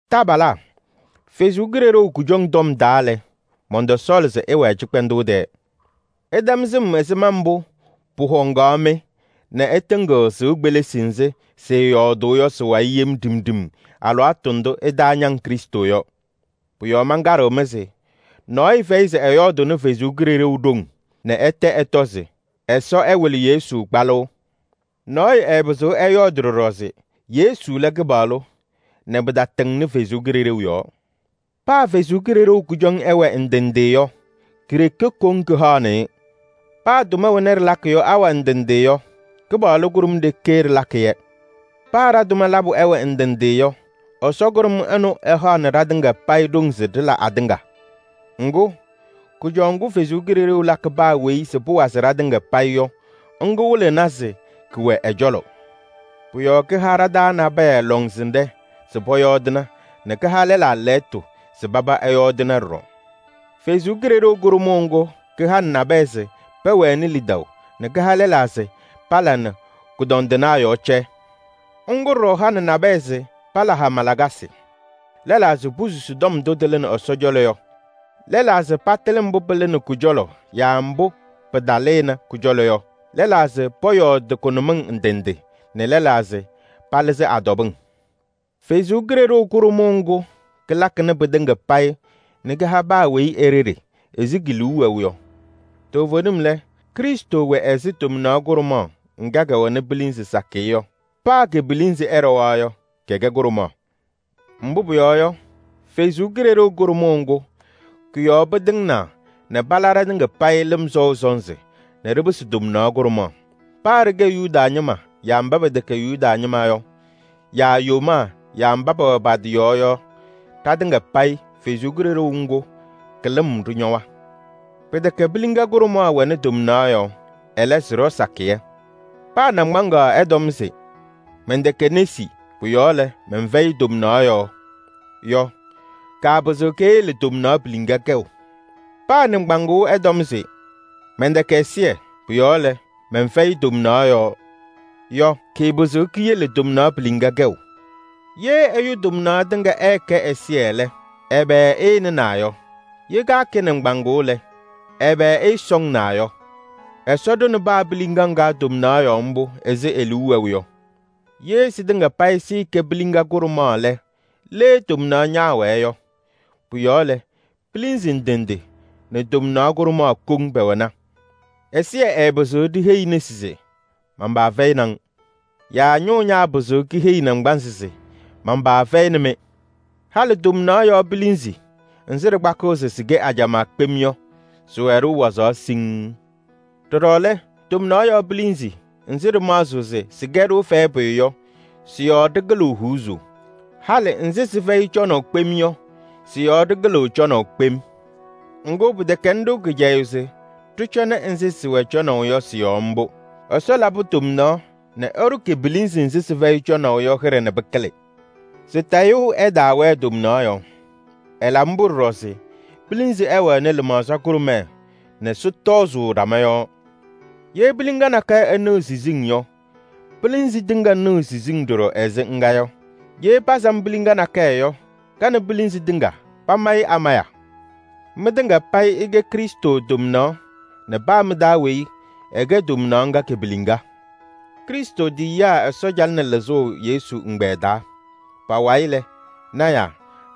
Taabalaa, Ɛsɔ Kalɩzaɣ kʋjɔŋ tɔm taa lɛ, mɔntɔsɔɔlɩ se ɩwɛɛ cɩkpɛndʋʋ tɛɛ. Ɩtɛm sɩm ɛzɩma mbʋ pʋhɔŋaɣ-mɩ nɛ ɩtɩŋɩɣ sɩʋ kpelisi nzɩ sɩɩyɔɔdʋʋ yɔ sɩ-wayɩ yem ɖimɖim alɩwaatʋ ndʋ ɩtaañaŋ Krɩstʋ yɔ. Pʋ-yɔɔ mankaɖɩɣ-mɩ se: nɔɔyʋ fɛyɩ se ɛyɔɔdʋʋnɩ Ɛsɔ Kalɩzaɣ ɖoŋ nɛ ɛtɛ ɛtɔ se: “Ɛsɔ ɛwɩlɩ Yesu kpalʋʋ.” Nɔɔyʋ ɛɛpɩzɩɣ ɛyɔɔdɩ ɖɔɖɔ se: “Yesu lɛ Kɩpaɣlʋ” nɛ pɩtatɩŋnɩ Ɛsɔ Kalɩzaɣ yɔɔ. Paa Ɛsɔ Kalɩzaɣ kʋjɔŋ ɩwɛ ndɩ ndɩ yɔ, ke-ɖeke koŋ kahaɣnɩ-ɩ. Paa tʋma wena ɖɩlakɩ yɔ awɛ ndɩ ndɩ yɔ, Kɩpaɣlʋ kʋɖʋm ɖeke ɖɩlakɩ-yɛ. Paa ɖa-tʋma labʋ ɛwɛ ndɩ ndɩ yɔ, Ɛsɔ kʋɖʋm ɛnʋ ɛhaɣnɩ ɖatɩŋa payɩ ɖoŋ se ɖɩla atɩŋa. Ŋgʋ, kʋjɔʋ ŋgʋ Ɛsɔ Kalɩzaɣ lakɩ paa weyi se pʋwazɩ ɖatɩŋa payɩ yɔ, kɩwɩlɩɣna se kɛwɛ ɛ-cɔlɔ. Pʋ-yɔɔ kaha ɖa-taa nabɛyɛ lɔŋsɩnɖɛ se pɔyɔɔdɩna, nɛ kaha lɛlaa lɛɣtʋ se paba ɛyɔɔdɩna ɖɔɖɔ. Kalɩzaɣ kʋɖʋmaɣ ŋga kahanɩ nabɛyɛ se pɛwɛnɩ lidaʋ nɛ kaha lɛlaa se pala nɛ kʋdɔndɩnaa yɔɔ cɛ. Ŋga ɖɔɖɔ hanɩ nabɛyɛ se pala hama lakasɩ, lɛlaa se posusi tɔm ndʋ tɩlɩnɩ Ɛsɔ cɔlɔ yɔ, lɛlaa se patɩlɩ mbʋ pɩlɩnɩ Kɔ-cɔlɔ yaa mbʋ pɩtalɩnɩ kɔ-cɔlɔ yɔ, lɛlaa se pɔyɔɔdɩ kʋnʋmɩŋ ndɩ ndɩ nɛ lɛlaa se palɩzɩ a-tɔbɩŋ. Ɛsɔ Kalɩzaɣ kʋɖʋmaɣ ŋga kalakɩnɩ pɩtɩŋa payɩ nɛ kaha paa weyi e-ɖeɖe ɛzɩ ke-liu wɛʋ yɔ. Toovenim lɛ, Krɩstʋ wɛ ɛzɩ tomnaɣ kʋɖʋmaɣ ŋga kɛwɛnɩ pilinzi sakɩyɛ yɔ. Paa ke-pilinzi ɛɖɔwa yɔ, kɛkɛ kʋɖʋmaɣ. Mbʋ pʋyɔɔ yɔ, Ɛsɔ Kalɩzaɣ kʋɖʋmaɣ ŋga kɔ-yɔɔ pɩtɩŋnaa nɛ pala ɖatɩŋa payɩ lɩm sɔʋ sɔnzɩ nɛ ɖɩpɩsɩ tomnaɣ kʋɖʋmaɣ. Paa ɖɩkɛ Yuda ñɩma yaa mba pɛtɛkɛ Yuda ñɩma yɔ, yaa yomaa yaa mba pɛwɛ pa-tɩ yɔɔ yɔ, ɖatɩŋa payɩ Kalɩzaɣ kʋɖʋmaɣ ŋga ka-lɩm ɖɩñɔwa. Pɩtɛkɛ piliŋa kʋɖʋmaɣ wɛnɩ tomnaɣ yɔɔ, ɛlɛ, sɩɖɔ sakɩyɛ. Paa naŋgbaŋaɣ ɛtɔm se: “Mɛntɛkɛ nesi, pʋ-yɔɔ lɛ, mɛnfɛyɩ tomnaɣ yɔɔ” yɔ, kaapɩzɩɣ keyele tomnaɣ piliŋa kɛʋ. Paa nɩŋgbaŋʋʋ ɛtɔm se: “Mɛntɛkɛ ɛzɩyɛ, pʋ-yɔɔ lɛ, mɛnfɛyɩ tomnaɣ yɔɔ” yɔ, kɩɩpɩzɩɣ kiyele tomnaɣ piliŋa kɛʋ. Ye ɛyʋ tomnaɣ tɩŋa ɛɛkɛ ɛzɩyɛ lɛ, ɛbɛ ɛɛnɩnaa yɔ? Ye kaakɛ nɩŋgbaŋʋʋ lɛ, ɛbɛ ɛɛsɔŋnaa yɔ? Ɛsɔ ɖʋnɩ paa piliŋa ŋga tomnaɣ yɔɔ mbʋ ɛzɩ e-liu wɛʋ yɔ. Ye sɩtɩŋa payɩ sɩɩkɛ piliŋa kʋɖʋmaɣ lɛ, le tomnaɣ ñaawɛɛ yɔ? Pʋ-yɔɔ lɛ, pilinzi ndɩ ndɩ nɛ tomnaɣ kʋɖʋmaɣ koŋ pɛwɛna. Ɛsɩyɛ ɛɛpɩzɩɣ ɖiheyi nesi se: “Man-paa fɛyɩnɩ-ŋ.” Yaa ñʋʋ ñaapɩzɩɣ kiheyi naŋgbanzɩ se: “Man-paa fɛyɩnɩ-mɩ.” Halɩ tomnaɣ yɔɔ pilinzi nzɩ ɖɩkpakɩɣ se sɩkɛ ajamaa kpem yɔ, sɩwɛ-ɖʋ wazaɣ siŋŋ. Ɖɔɖɔ lɛ, tomnaɣ yɔɔ pilinzi nzɩ ɖɩmaɣzɩɣ se sɩkɛ-ɖʋ fɛyɛ pʋyʋ yɔ, sɩ-yɔɔ ɖɩkɩlɩɣ huuzuu. Halɩ nzɩ sɩfɛyɩ cɔnaʋ kpem yɔ, sɩ-yɔɔ ɖɩkɩlɩɣ cɔnaʋ kpem. Ŋgʋ, pɩtɛkɛnɩ-ɖʋ kɩcɛyʋʋ se ɖɩcɔŋnɩ nzɩ sɩwɛ cɔnaʋ yɔ sɩ-yɔɔ mbʋ. Ɛsɔ labɩ tomnaɣ nɛ ɛɖʋ ke-pilinzi nzɩ sɩfɛyɩ cɔnaʋ yɔ hɩɖɛ nɛ pɩkɩlɩ se tayʋʋ ɛtaawɛɛ tomnaɣ yɔɔ. Ɛlabɩ mbʋ ɖɔɖɔ se pilinzi ɛwɛnɩ lɩmaɣza kʋɖʋmɛɛ nɛ sɩtɔzʋʋ ɖama yɔɔ. Ye piliŋa nakɛyɛ ɛnɩɣ siziŋ yɔ, pilinzi tɩŋa nɩɣ siziŋ ɖɔɖɔ ɛzɩ ŋga yɔ. Ye pasam piliŋa nakɛyɛ yɔ, ka nɛ pilinzi tɩŋa pamayɩɣ amaya. Mɩtɩŋa payɩ ɩkɛ Krɩstʋ tomnaɣ nɛ paa mɩ-taa weyi ɛkɛ tomnaɣ ŋga ke-piliŋa. Krɩstʋ tiyiyaa Ɛsɔ calɩnɩ lɩzʋʋ Yesu ɛgbɛyɛ taa. Pa-wayɩ lɛ, lɔɔyɩsɩ tɩnaa,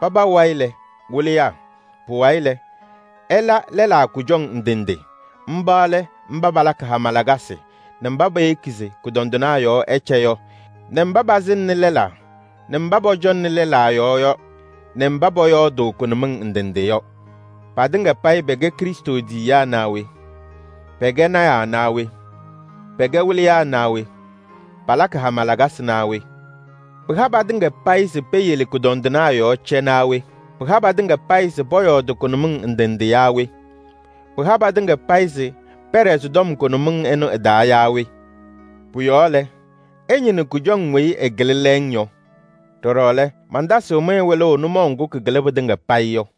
paba wayɩ lɛ, wɩlɩyaa. Pʋwayɩ lɛ, ɛla lɛlaa kʋjɔŋ ndɩ ndɩ: mba lɛ mba palakɩ hama lakasɩ nɛ mba peyeki se kʋdɔndɩnaa yɔɔ ɛcɛ yɔ nɛ mba pasɩŋnɩ lɛlaa nɛ mba pɔcɔŋnɩ lɛlaa yɔɔ yɔ nɛ mba pɔyɔɔdʋʋ kʋnʋmɩŋ ndɩ ndɩ yɔ. Patɩŋa payɩ pɛkɛ Krɩstʋ tiyiyaa naa we? Pɛkɛ lɔɔyɩsɩ tɩnaa naa we? Pɛkɛ wɩlɩyaa naa we? Palakɩ hama lakasɩ naa we? Pɩha patɩŋa payɩ se peyele kʋdɔndɩnaa yɔɔ cɛ naa we? Pɩha patɩŋa payɩ se pɔyɔɔdɩ kʋnʋmɩŋ ndɩ ndɩ yaa we? Pɩha patɩŋa payɩ se palɩzɩ a-tɔbɩŋ naa we? Pʋ-yɔɔ lɛ, ɩñɩnɩ kʋjɔŋ weyi ɩkɩlɩ lɛɛŋ yɔ. Ɖɔɖɔ lɛ, mantasɩɣ-mɩ wɩlʋʋ nʋmɔʋ ŋgʋ kɩkɩlɩ pɩtɩŋa payɩ yɔ.